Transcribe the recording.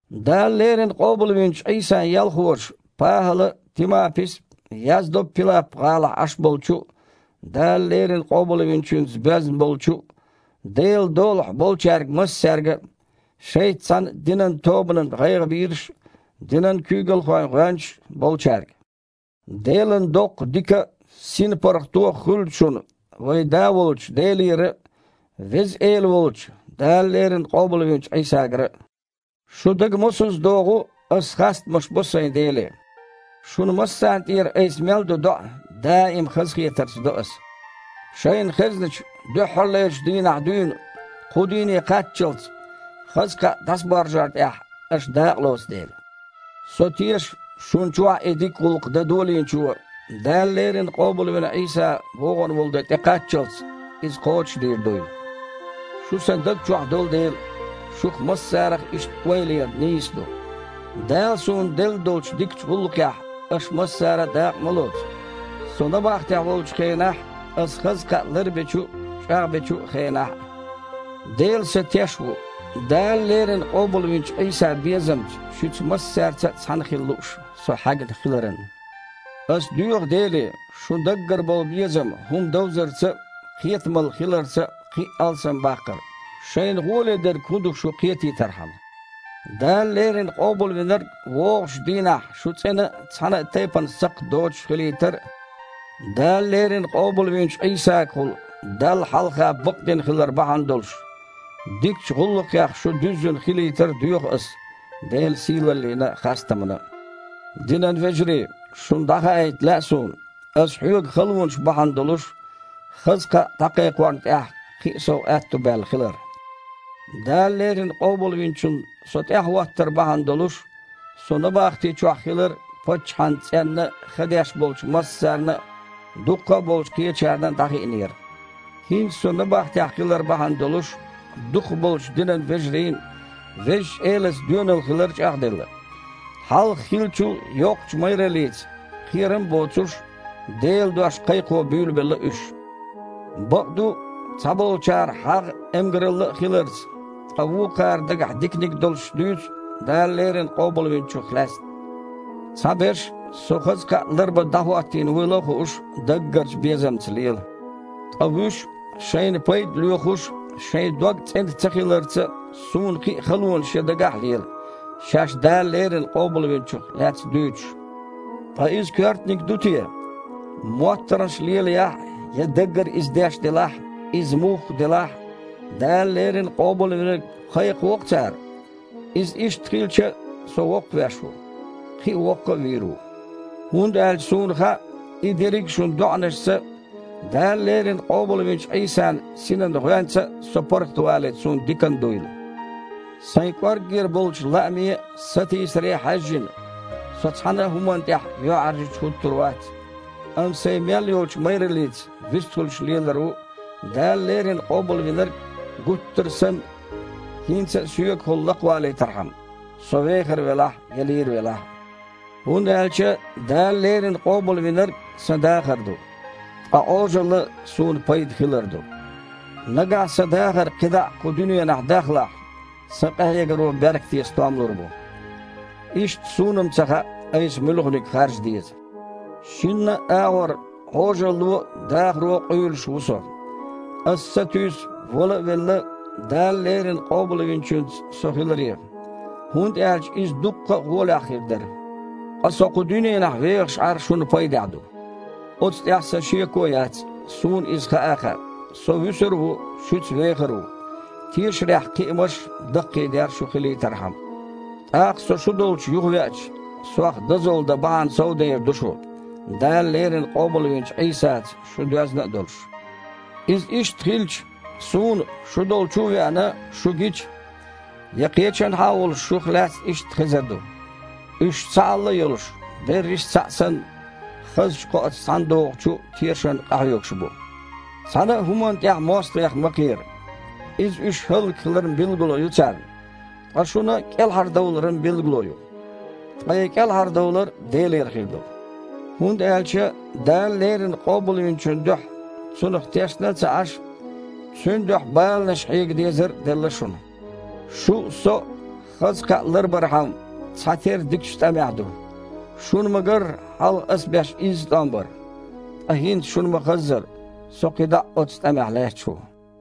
Дала леррина къобалвинчу Іийсан ялхоша, ПахІала а, Тимапис а, яздо Пилап-гІалахь Іаш болчу а, Дала леррина Къобалвинчуьнца боьзна болчу а Делан долахь болчаьрга массаьрга – шайца цхьаьна динан тобанан гІайгІабийраш а, динан куьйгалхойн гІоьнчаш а болчаьрга. Делан доккха дика а, синпаргІато а хуьлда шуна вайн Да волчу Делера а, Веза Эла волчу, Дала леррина къобалвинчу Іийсагара а. Шу дага мосазза догІу, аса хастамаш бо сайн Деле. Шуна массарна тІера айса мел до доІа даим хазахетарца до аса, шайна хезначу дуьххьарлерчу дийнахь дуьйна кху дийне кхаччалц, хаза кхаъ дІасабаржор тІехь аша дакъалоцу дела. Со теша, шуна чохь и дика гІуллакх дан Долийначо, Дала леррина къобалвина Іийса вогІун волу де тІекхаччалц, иза кхочушдийр дуйла. Шу сан даг чохь долу дела, шух массарах иштта ойла яр нийса ду. Дала суна делла долчу дикачу гІуллакхехь аша массара а дакъа ма лоцу – со набахтехь волчу хенахь а, аса хаза кхаъ ларбечу а, чІагІбечу а хенахь а. Дела сан Теш ву, Дала леррина къобалвинчу Іийсан безамца шуьца массаьрца а цхьаьна хила лууш со хьаьгна хиларан. Аса доьху Деле шун даггара болу безам хІума довзарца а, кхетамалла хиларца а кхин а алсамбаккхар, шайна гІоле дерг хІун ду шу кхетийтархьама. Дала леррина Къобалвинарг вогІучу дийнахь шу цІена а, цхьана а тайпана сакхт доцуш а хилийтар а, Дала леррина къобалвинчу Іийсагахула Далла хьалха бакъдина хилар бахьана долуш, дикачу гІуллакхех шу дуьззина хилийтар а доьху ас Делан сийлаллина а, хастамана а. Динан вежарий, шуна дІахаийта лаьа суна, аса хьоьгу халонаш бахьана долуш, хаза кхаъ дІакхайкхорна тІехь кхин а сов аьтто баьлла хилар. Дала леррина Къобалвинчунна со тІаьхьахІоттар бахьана долуш, со набахти чохь хилар паччахьан цІенна ха деш болчу массарна а, дуккха а болчу кхечарна а дІахиънера. ХІинца со набахтехь хилар бахьана долуш, дукхахболчу динан вежарийн Везачу Элаца доьналла хилар чІагІделла. Хьалха хиллачул а йоккхачу майраллица, кхерам а боцуш, Делан дош кхайкхо буьйлабелла уьш. Бакъду, цхьаболчара хьагІ а, эмгаралла а хиларца, ткъа вукхара дагахь диканиг долуш дуьйцу Дала леррина Къобалвинчух лаьцна. Цхьаберш, со хаза кхаъ ларбан дІахІоттийна вуйла а хууш, даггарчу безамца лела. Ткъа вуьш, шайна пайда лоьхуш а, шайн дог цІена цахиларца а, суна кхин а халонаш ян дагахь а лела, шаьш Дала леррина Къобалвинчух лаьцна дуьйцуш. Ткъа иза коьртаниг ду те? МоттаргІанаш лелаяхь а, я даггара иза деш делахь а, иза мухха делахь а, Дала леррина Къобалвинарг кхайкхаво-кх цара. Иза иштта хилча а, со воккхавеш ву! Кхин а воккха а вийр ву. ХІунда аьлча суна хаьа, и дерриг а шун доІанашца а, Дала леррина къобалвинчу Іийсан Синан гІоьнца а со паргІатвалийта суна диканна дуйла. Сайн кІорггера болчу лааме а, сатийсаре а хьаьжжина, со цхьана а хІуманна тІехь юьхьІаьржачу хІуттур вац, амма сайн мел йолчу майраллица вистхуьлуш лелар ву Дала леррина Къобалвинарг, гуттара а санна, хІинца а соьгахула лакхавалийтархьама – со вехар велахь а, я лийр велахь а. ХІунда аьлча Дала леррина Къобалвинарг – сан дахар ду, ткъа Іожалла – суна пайда хилар ду. Нагахь сан дахар кхидІа а кху дуьненахь дахлахь, сан къахьегаро беркате стом лур бу. Иштта суна-м ца хаьа, айса муьлханиг харжа деза. Шинна а агІор Іожалло а, дахаро а, къуьйлуш ву со. Аса сатуьйсу, вала а велла, Дала леррина Къобалвинчуьнца со хиларе, хІунда аьлча иза дуккха а гІолехь хир дара. Ткъа со кху дуьненахь вехаш Іар шуна пайдехь ду. Оцу тІехь сан шеко а яц, суна иза хаа а хаьа: со вуьсур а ву, шуьца вехар а ву, тешарехь кхиамаш а, даккхийдер а шун хилийтархьама. ТІаккха со шу долчу юхавеача, сох дозалла дан бахьана совдер ду шун, Дала леррина къобалвинчу Іийсаца шу доьзна а долуш. Иза иштта хилча, суна, шу долчу а веана, шу гича, я кхечанхьа а волуш, шух лаьцна иштта хезар ду: уьш цхьаалла а йолуш, берриш а цхьаъ санна, хазачу кхоаца цхьаьнадогІучу тешарна къахьоьгуш бу. Цхьана а хІуманна тІехь мостагІех ма кхера: иза уьш хІаллакьхиларан билгало ю царна, ткъа шуна – кІелхьардовларан билгало ю. Ткъа и кІелхьардовлар Делера хир ду. ХІунда аьлча Дала леррина Къобалвинчун дуьхьа Цунах тешна а ца Іаш, Цуьнан дуьхьа баланаш хьега дезар а делла шуна. Шу а, со а хаза кхаъ ларбархьама цхьатерра дикачу тІамехь ду. Шуна ма-гарра, хьалха а ас беш изза тІом бара. Ткъа хІинца, шуна ма-хаззара, со кхидІа а оццу тІамехь лаьтташ ву.